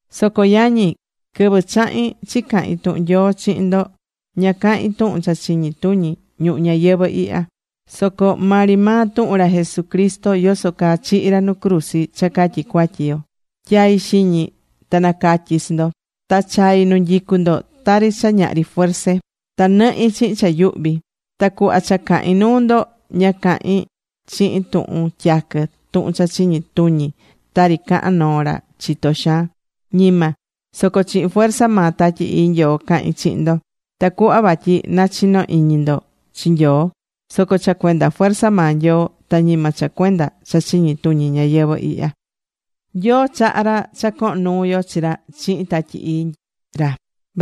Soco yañi, quɨvɨ chahi̱n chicahin tuhun Nyoo chihin ndo, ña cahi̱n tuhun cha chiñi tuñi ñuhu ñayɨvɨ̱ ihya. Soco maa ri maa tuhun ra Jesucristo, yoso caa chihi̱ ra nu cruzi cha catyi cuatyi yo tyai̱ xiñi ta nacatyi̱ chi ndo. Ta chai̱ nu nyicu ndo tari cha ñahri fuerze. Ta nɨhi̱ chihin cha yuhvi. Ta cuhva cha cahi̱n nuu ndo, ña cahi̱n chihin tuhun tyaquɨ tuhun cha chiñi tuñi tari cahán noo ra chitó xaan. Ñima. Soco chihin fuerza maa Tatyi Ii Nyoo cahi̱n chihin ndo. Tacuhva vatyi nachino iñi ndo chi Nyoo soco cha cuenda fuerza maa Nyoo. Ta ñima cha cuenda cha chiñi tuñi ñayɨvɨ̱ ihya.Nyoo chahá ra cha cohon nuu yo chi ra chihin Tatyi Ii ra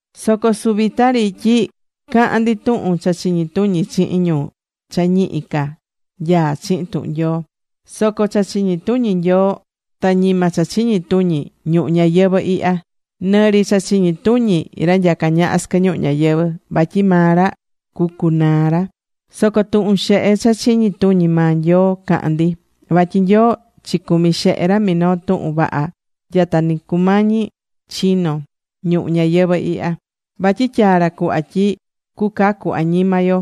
Soco suvita ri tyi cahán ndi tuhun cha chiñi tuñi chihin ñu cha ñihi ca nyaá chihin tuhun Nyoo. Soco cha chiñi tuñi Nyoo, ta ñima cha chiñi tuñi ñuhu ñayɨvɨ̱ ihya, nɨ ri cha chiñi tuñi ra nyacá ñaha sɨquɨ ñuhu ñayɨvɨ̱. Vatyi maa ra cucunaa ra. Soco tuhun xehe cha chiñi tuñi maa Nyoo cahán ndi. Vatyi Nyoo chicumi̱ xehe ra minoo tuhun vaha nya ta ni cumañi chino ñuhu ñayɨvɨ̱ ihya. Vatyi tyaa̱ ra cuhva tyi cucacu añima yo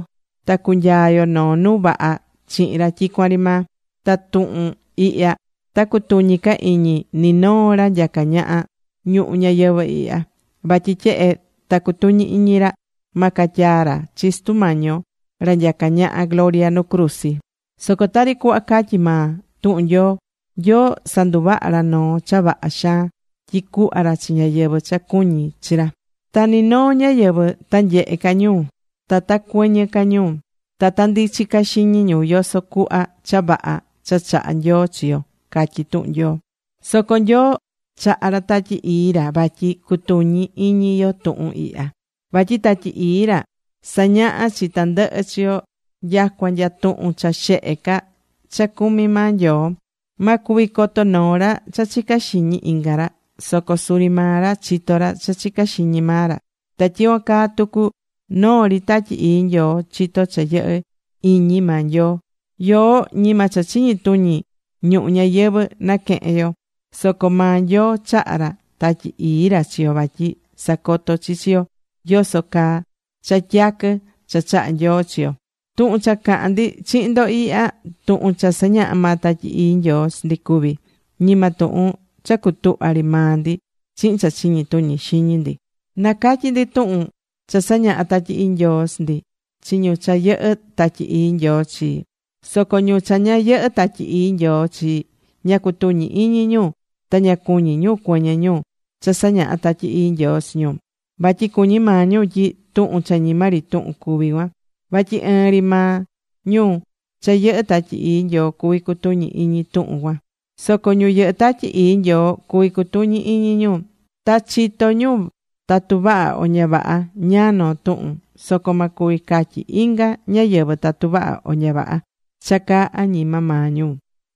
ta cunyaa yo noo nu vaha chihin ra tyicuan ri maa. Ta tuhun ihya ta cutuñi ca iñi ni noo ra nyacá ñaha ñuhu ñayɨvɨ̱ ihya. Vatyi tyehe ta cutuñi̱ iñi ra, ma catyaa ra chi Sutu Mañi yo, ra nyacá ñaha gloria, nu cruzi. Soco tari cuhva catyí maa tuhun Nyoo: Nyoo sanduvaha̱ ra noo cha vaha xaan tyi cuhva ra chi ñáyɨvɨ cha cuñí chi ra. Ta ni noo ñáyɨvɨ ta nyehe ca ñu, ta ta cuɨñɨ ca ñu, ta ta ndichi ca xiñi ñu yoso cuhva cha vaha cha chahá Nyoo chi yo, catyí tuhun Nyoo. Soco Nyoo chahá ra Tatyi Ii ra vatyi cutuñi iñi yo tuhun ihya. Vatyi Tatyi Ii ra sañahá chi tandɨhɨ chi yo nyacua nya tuhun cha xehe ca cha cumi̱ maa Nyoo. Ma cuvi coto noo ra cha chicá xiñi inga ra. Soco suri maa ra chitó ra cha chicá xiñi maa ra. Ta tyicuan caa tucu noo ri Tatyi Ii Nyoo chitó cha yɨhɨ́ iñi maa Nyoo. Yoó ñima cha chiñi tuñi ñuhu ñayɨvɨ̱ naquehe̱n yo, soco maa Nyoo chaha̱ ra Tatyi Ii ra chi yo vatyi sacoto chi chi yo yoso caa cha tyaquɨ cha chahá Nyoo chi yo. Tuhun cha cahán ndi chihin ndo ihya, tuhun cha sañahá maa Tatyi Ii Nyoo chi ndi cuví. Ñima tuhun cha cutuhva̱ ri maa ndi chihin cha chiñi tuñi xiñi ndi. Nacatyí ndi tuhun cha sañahá Tatyi Ii Nyoo chi ndi chi ñu cha yɨhɨ́ Tatyi Ii Nyoo chi. Soco ñu cha ña yɨhɨ́ Tatyi Ii Nyoo chi, ña cutuñí iñi ñu ta ña cuñí ñu cuɨñɨ ñu cha sañaha Tatyi Ii Nyoo chi ñu, vatyi cuñí maa ñu tyi tuhun cha ñima ri tuhun cuví cuan. Vatyi ɨɨn ri maa ñu cha yɨhɨ́ Tatyi Ii Nyoo cuví cutuñí iñi ñu tuhun cuan. Soco ñu yɨhɨ́ Tatyi Ii Nyoo cuví cutuñi iñi ñu. Ta chitó ñu tatu vaha o ña vaha ñáá noo tuhun. Soco ma cuvi catyi inga ñáyɨvɨ tatu vaha o ña vaha cha caá añima maa ñu.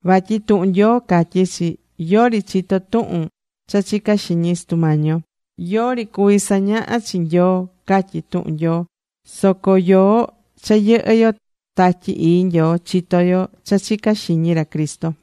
Vatyi tuhun Nyoo catyí chi: “Yori chitó tuhun cha chicá xiñi Sutu Mañi yo. Yori cuví sañahá chi Nyoo”, catyí tuhun Nyoo. Soco yoó cha yɨhɨ yo Tatyi Ii Nyoo, chitó yo cha chicá xiñi ra Cristo.